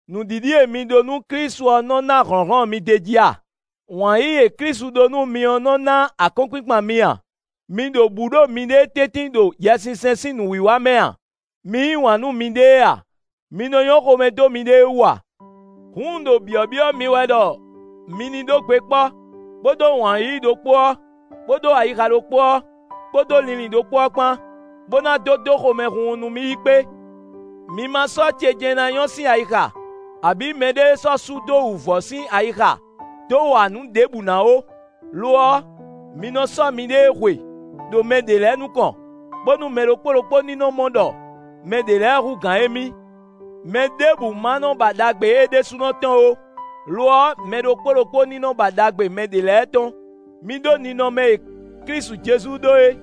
Nǔɖiɖi e mi ɖó nú Klísu ɔ́ nɔ́ ná hlɔ̌nhlɔ́n mi d'é jí a? Wǎn yíyí e Klísu ɖó nú mi ɔ́ nɔ́ ná akɔ́nkpinkpan mi a? Mi ɖo bǔ ɖo miɖée tɛ́ntin ɖo Yɛsinsɛn sín nǔwiwa mɛ a? Mi yí wǎn nú miɖée a? Mi nɔ nyɔ́ xomɛ dó miɖée wú a? Hǔn un ɖo byɔ̌byɔ́ mi wɛ ɖɔ mi ní ɖó gbe kpɔ́, bó ɖó wǎn yíyí ɖokpó ɔ́, bó ɖó ayixa ɖokpó ɔ́ kpódó linlin ɖokpó ɔ́ kpán, bó ná dó dó xomɛhunhun nú mì yi kpé. Mi ma sɔ́ ce jɛ́n ná nyɔ́ sín ayixa, abǐ mɛɖée sɔ́ su dó wǔvɔ́ sín ayixa dó wa nǔ ɖěbǔ ná ó; lo ɔ́, mi nɔ sɔ́ miɖée hwe ɖo mɛ ɖě lɛ́ɛ nukɔn, bónú mɛ ɖokpó ɖokpó ní nɔ mɔ ɖɔ mɛ ɖě lɛ́ɛ hú gǎn émí. Mɛɖěbǔ ma nɔ ba ɖagbe é ɖésúnɔ tɔn ó; lo ɔ́, mɛ ɖokpó ɖokpó ní nɔ ba ɖagbe mɛ ɖě lɛ́ɛ tɔn. Mi ɖó ninɔmɛ e Klísu Jezu ɖó é.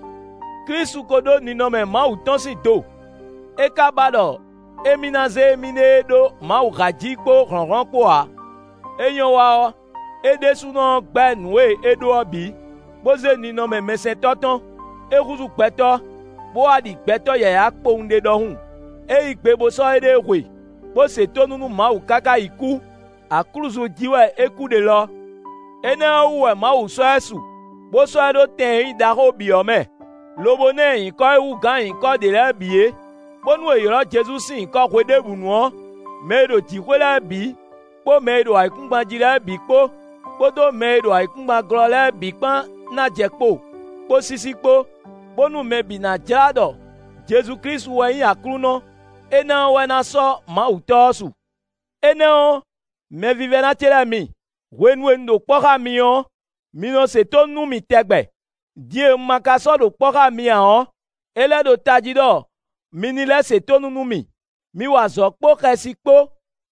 Klísu ko ɖó ninɔmɛ Mawu tɔn sín do; é ka ba ɖɔ émí ná zé émíɖée ɖó Mawu há jí kpó hlɔ̌nhlɔ́n kpó ǎ. É nyɔ́ wa ɔ́, é ɖésúnɔ ɔ́ gbɛ́ nǔ e é ɖó ɔ́ bǐ, bó zé ninɔmɛ mɛsɛntɔ́ tɔn. É húzú gbɛtɔ́, bó wá ɖi gbɛtɔ́ yǎyá kpowun ɖé ɖɔhun. É yí gbe bó sɔ́ éɖée hwe, bó se tónú nú Mawu káká yi kú; aklúzu jí wɛ é kú ɖe lɔ. Énɛ́ ɔ́ wú wɛ Mawu sɔ́ ɛ su, bó sɔ́ ɛ ɖó tɛn e nyí ɖaxó bǐ ɔ́ mɛ, lobo ná ɛ nyǐkɔ e hú gǎn nyǐkɔ ɖě lɛ́ɛ bǐ é, bónú è ylɔ̌ Jezu sín nyǐkɔ hweɖěbǔnu ɔ́, mɛ e ɖo jǐxwé lɛ́ɛ bǐ, kpó mɛ e ɖo ayǐkúngban jí lɛ́ɛ bǐ kpó, kpódó mɛ e ɖo ayǐkúngban glɔ́ lɛ́ɛ bǐ kpán ná jɛ kpo kpó sísí kpó, bónú mɛ bǐ ná jlá ɖɔ Jezu Klísu wɛ nyí Aklúnɔ; énɛ́ ɔ́ wɛ ná sɔ́ Mawu Tɔ́ ɔ́ su. Énɛ́ ɔ́, mɛvívɛ́ná ce lɛ́ɛ mi, hwenu e un ɖo kpɔ́ xá mi ɔ́, mi nɔ se tónú nú mì tɛgbɛ; din e un ma ka sɔ́ ɖo kpɔ́ xá mi ǎ ɔ́, é lɛ́ ɖo tají ɖɔ mi ní lɛ́ se tónú nú mì. Mi wa azɔ̌ kpó xɛsi kpó,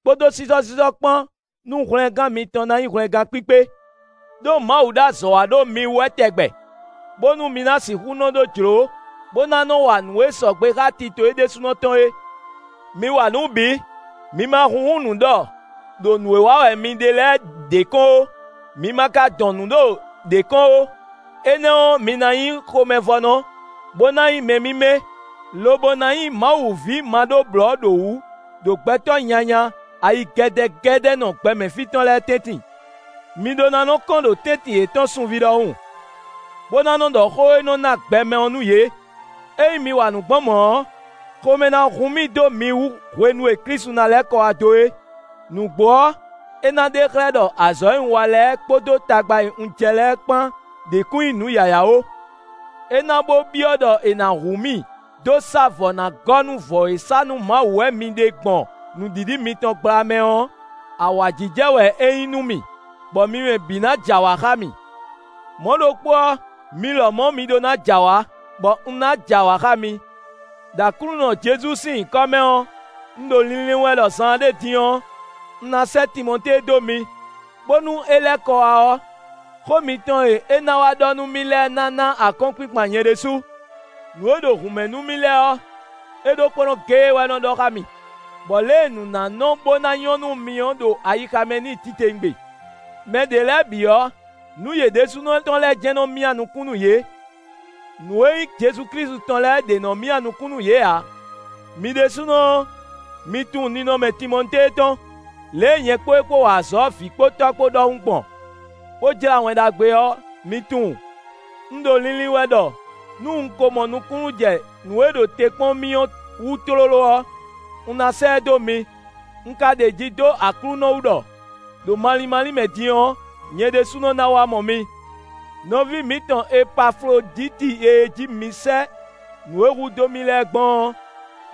kpódó sísɔ́sísɔ́ kpán nú hwlɛngán mitɔn ná nyí hwlɛngán kpíkpé. Đó Mawu ɖo azɔ̌ wa ɖo mi wú wɛ tɛgbɛ, bónú mi ná sixú nɔ ɖó jló, bó ná nɔ wa nǔ e sɔgbe xá tito é ɖésúnɔ tɔn é. Mi wa nǔ bǐ; mi ma húnhún nǔ ɖɔ ɖo nǔ e wa wɛ mi ɖe lɛ́ɛ ɖě kɔn ó, mi ma ka dɔn nǔ ɖo ɖě kɔn ó; énɛ́ ɔ́, mi ná nyí xomɛvɔ́nɔ, bó ná nyí mɛ mímɛ́, lobo ná nyí Mawu ví maɖóblɔ̌ɖowǔ ɖo gbɛtɔ́ nyanya, ayigɛ́dɛ́gɛ́dɛ́nɔ gbɛmɛ fí tɔn lɛ́ɛ tɛ́ntin. Mi ɖó ná nɔ kɔ́n ɖo tɛ́ntin yětɔn sunví ɖɔhun, bó ná nɔ ɖɔ xó e nɔ ná gbɛ mɛ ɔ́ nú yě. Ényí mi wa nǔ gbɔn mɔ̌ ɔ́, xomɛ ná hun mì dó mi wú hwenu e Klísu ná lɛ́ kɔ wá dó é; nǔgbó ɔ́, é ná ɖe xlɛ́ ɖɔ azɔ̌ e un wa lɛ́ɛ, kpódó tagba e un jɛ lɛ́ɛ kpán ɖě kún nyí nǔ yǎyá ó. É ná bó byɔ́ ɖɔ è nǎ hu mì dó sá vɔ̌ ná gɔ́ nú vɔ̌ e sá nú Mawu wɛ mi ɖe gbɔn nǔɖiɖi mitɔn gbla mɛ ɔ́, awǎjijɛ wɛ é nyí nú mì, bɔ mi mɛ bǐ ná jɛ awǎ xá mì. Mɔ̌ ɖokpó ɔ́, mi lɔmɔ̌ mi ɖó ná jɛ awǎ, bɔ un ná jɛ awǎ xá mi. Đo Aklúnɔ Jezu sín nyǐkɔ mɛ ɔ́, un ɖo linlin wɛ ɖɔ zaanɖé din ɔ́, un ná sɛ́ Timɔtée dó mi, bónú é lɛ́ kɔ wá ɔ́, xó mitɔn e é ná wá ɖɔ nú mì lɛ́ɛ ná ná akɔ́nkpinkpan nyɛ ɖésú. Nǔ e ɖo hǔn mɛ nú mì lɛ́ɛ ɔ́, é ɖokpónɔ géé wɛ nɔ ɖɔ xá mì, bɔ lě e nǔ ná nɔ bó ná nyɔ́ nú mi ɔ́ ɖo ayixa mɛ n'i titewungbe. Mɛɖě lɛ́ɛ bǐ ɔ́, nǔ yě ɖésúnɔ tɔn lɛ́ɛ jɛ́n nɔ myá nukún nú yě; nǔ e nyí Jezu Klísu tɔn lɛ́ɛ ɖě nɔ́ myá nukún nú yě ǎ. Mi ɖésúnɔ ɔ́, mi tunwun ninɔmɛ Timɔtée tɔn; lě e nyɛ kpó e kpó wa azɔ̌ vǐ kpó tɔ́ kpó ɖɔhun gbɔn, bó jlá Wɛn Ɖagbe ɔ́, mi tunwun. Un ɖo linlin wɛ ɖɔ nú un ko mɔ nukúnnú jɛ nǔ e ɖo te kpɔ́n mì ɔ́ wú tlóló ɔ́, un ná sɛ́ ɛ dó mi. Un ka ɖeji dó Aklúnɔ wú ɖɔ, ɖo malín málín mɛ din ɔ́, nyɛ ɖésúnɔ ná wá mɔ mi. Nɔví mǐtɔn Epafloditi e jí mi sɛ́ nǔ e hudó mì lɛ́ɛ gbɔn ɔ́,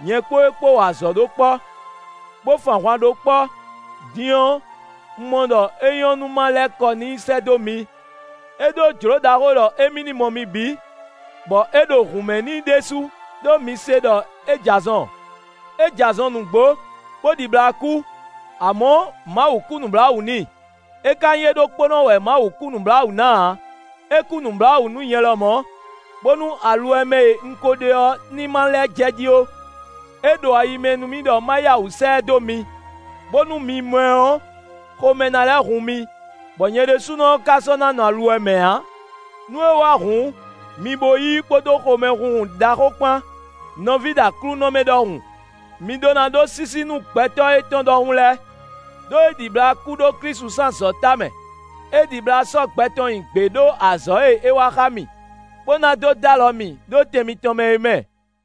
nyɛ kpó é kpó wa azɔ̌ ɖó kpɔ́, bó fun ahwan ɖó kpɔ́; din ɔ́, un mɔ ɖɔ é nyɔ́ nú ma lɛ́ kɔ n'i sɛ́ dó mi. É ɖó jlǒ ɖaxó ɖɔ émí ní mɔ mi bǐ, bɔ é ɖo hǔn mɛ n'i ɖésú, ɖó mi se ɖɔ é jɛ azɔn. É jɛ azɔn nǔgbó, bó ɖibla kú; amɔ̌, Mawu kú nǔbláwǔ n'i, é ka nyí é ɖokpó wɛ Mawu kú nǔbláwǔ ná ǎ; é kú nǔbláwǔ nú nyɛ lɔmɔ̌, bónú aluwɛ mɛ e un ko ɖe ɔ́ ní ma lɛ́ jɛ jí ó. É ɖo ayi mɛ nú mì ɖɔ ma yá wǔ sɛ́ ɛ dó mi, bónú mi mɔ ɛ ɔ́, xomɛ ná lɛ́ hun mi, bɔ nyɛ ɖésúnɔ ɔ́ ka sɔ́ ná nɔ aluwɛ mɛ ǎ. Nú é wá hǔn, mi bo yí i kpódó xomɛhunhun ɖaxó kpán, nɔví ɖo Aklúnɔ mɛ ɖɔhun. Mi ɖó ná ɖó sísí nú gbɛtɔ́ étɔn ɖɔhun lɛ́ɛ. Đó é ɖibla kú ɖó Klísu sín azɔ̌ tamɛ. É ɖibla sɔ́ gbɛ tɔn nyi gbě ɖo azɔ̌ e é wa xá mì, bó ná dó dó alɔ mì ɖó tɛn mitɔn mɛ é mɛ.